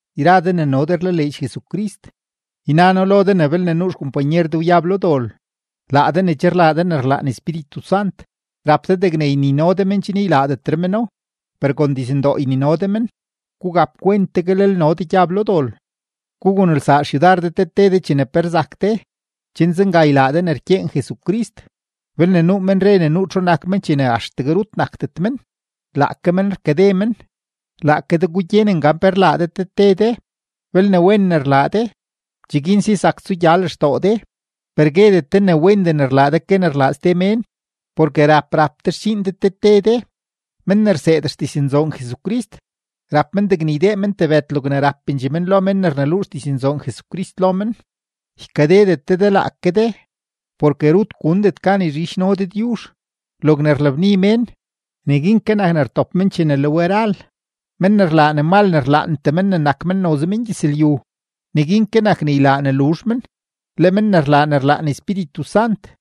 Yra de ne no de rlaleedx Jesucrist, yna noo lo de ne belne nuu xkompanyer de wyab lo dol, laa de ne che rlaa de ne rlaan Espíritu Sant, rap de degne ynino de men chen ylaadetre meno, per kon dizndoo ynino de men. Gugap kwent tegue lel no de gyab lo dol. Gugunelsaa xyudar de te te de chene pe rzak de, chen zenga ylaa de ne rkyeen Jesucrist. Belne nuu men re ne nuu txu nak men chene axtegue rut nakdet men, laake men rkade men. Laake de gugyenen gan pe rlaa de te te de; belne wen ne rlaa de, cheguin si zak tsugya lextoo de, per guedet de ne wendee ne rlaa de ke ne rlaa ste mén. Porke rap rap de xdxiin de te te de. Men ne rseed xdiznzoon Jesucrist, rap men degne ydee men tebëd logne rapendxee men lo men ne rneluu xdiznzoon Jesucrist lo men. Ykadedet de de laake de, porke rut gundet gan yzhidxno Dëdyuzh. Logne rlabni mén, neguin ke nak ne rtop men chene le we ral. Men ne rlaa ne mal ne rlaantee men ne nak men noze mengyëzlyu, neguin ke nak ne ylaa ne luzh men; le men ne rlaa ne rlaan Espíritu Sant,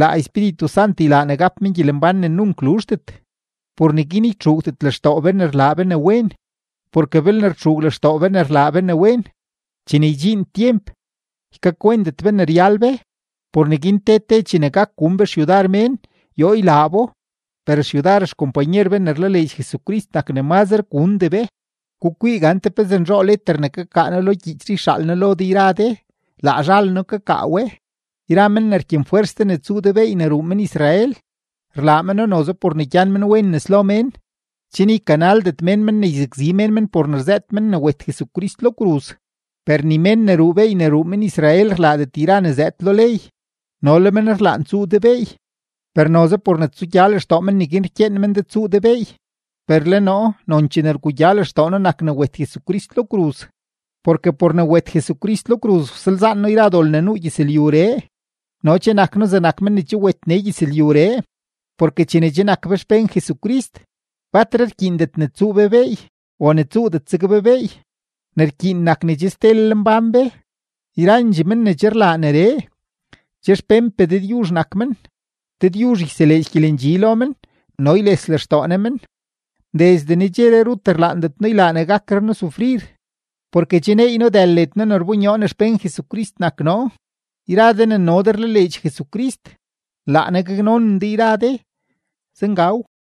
laa Espíritu Sant ylaa ne gap men gyelembán ne nunk luzhdet. Por neguin ytxuugdet lextoo be ne rlaa be ne wen, porke belne rtxuug lextoo be ne rlaa be ne wen, chene ydxiin tyemp, ykakwentet be ne ryal be. Por neguin te te chene gak gun be xyudar mén, yoo ylaa bo, per xyudar xkompanyer be ne rlaleedx Jesucrist nak ne mazre gundee be. Gukwii gante pezee nzhoo leter ne kakaa noo lo gyiich yxaal noo lo de yra de, laa zhal noo kakaa we. Yra men ne rkyenfwers de ne tsuu de beey ne ruu men-Israel, rlaa meno noze por ne gyan men wen nes lo mén, chen ykanaldet mén men ne yzakzi mén men por ne rzëët men ne wet Jesucrist lo kruz. Per ni mén ne ruu beey ne ruu men-Israel rlaadet yra ne zëëd lo ley, no le men rlaan ne tsuu de beey, per noze por ne tsugya lextoo men neguin rkyeen men de ne tsuu de beey. Per le noo, nonchee ne rgugya lextoo noo nak ne wet Jesucrist lo kruz; porke por ne wet Jesucrist lo kruz, wsalzaan noo yra dol ne nuu gyëzlyuree no che nak noo zegnak men ne che wet nee gyëzlyuree. Porke chene che nak be xpén Jesucrist, batre rkyiindet ne tsuu be beey o ne tsuudet zeg be beey. Ne rkyiin nak ne che stelel mbán be. Yrandxee men ne che rlaa neree, che xpénpee Dëdyuzh nak men; Dëdyuzh yseleedx gyelendxi lo men no yles lextoo Ne men. Desde nedxeree rut rlaandet noo ylaa ne gakre noo sufrir, porke che neey noo dël led noo ne rbonyoo ne xpén Jesucrist nak noo. Yra de ne no de rlaleedx Jesucrist, laa Ne gaknonen de yra de. Zengaw.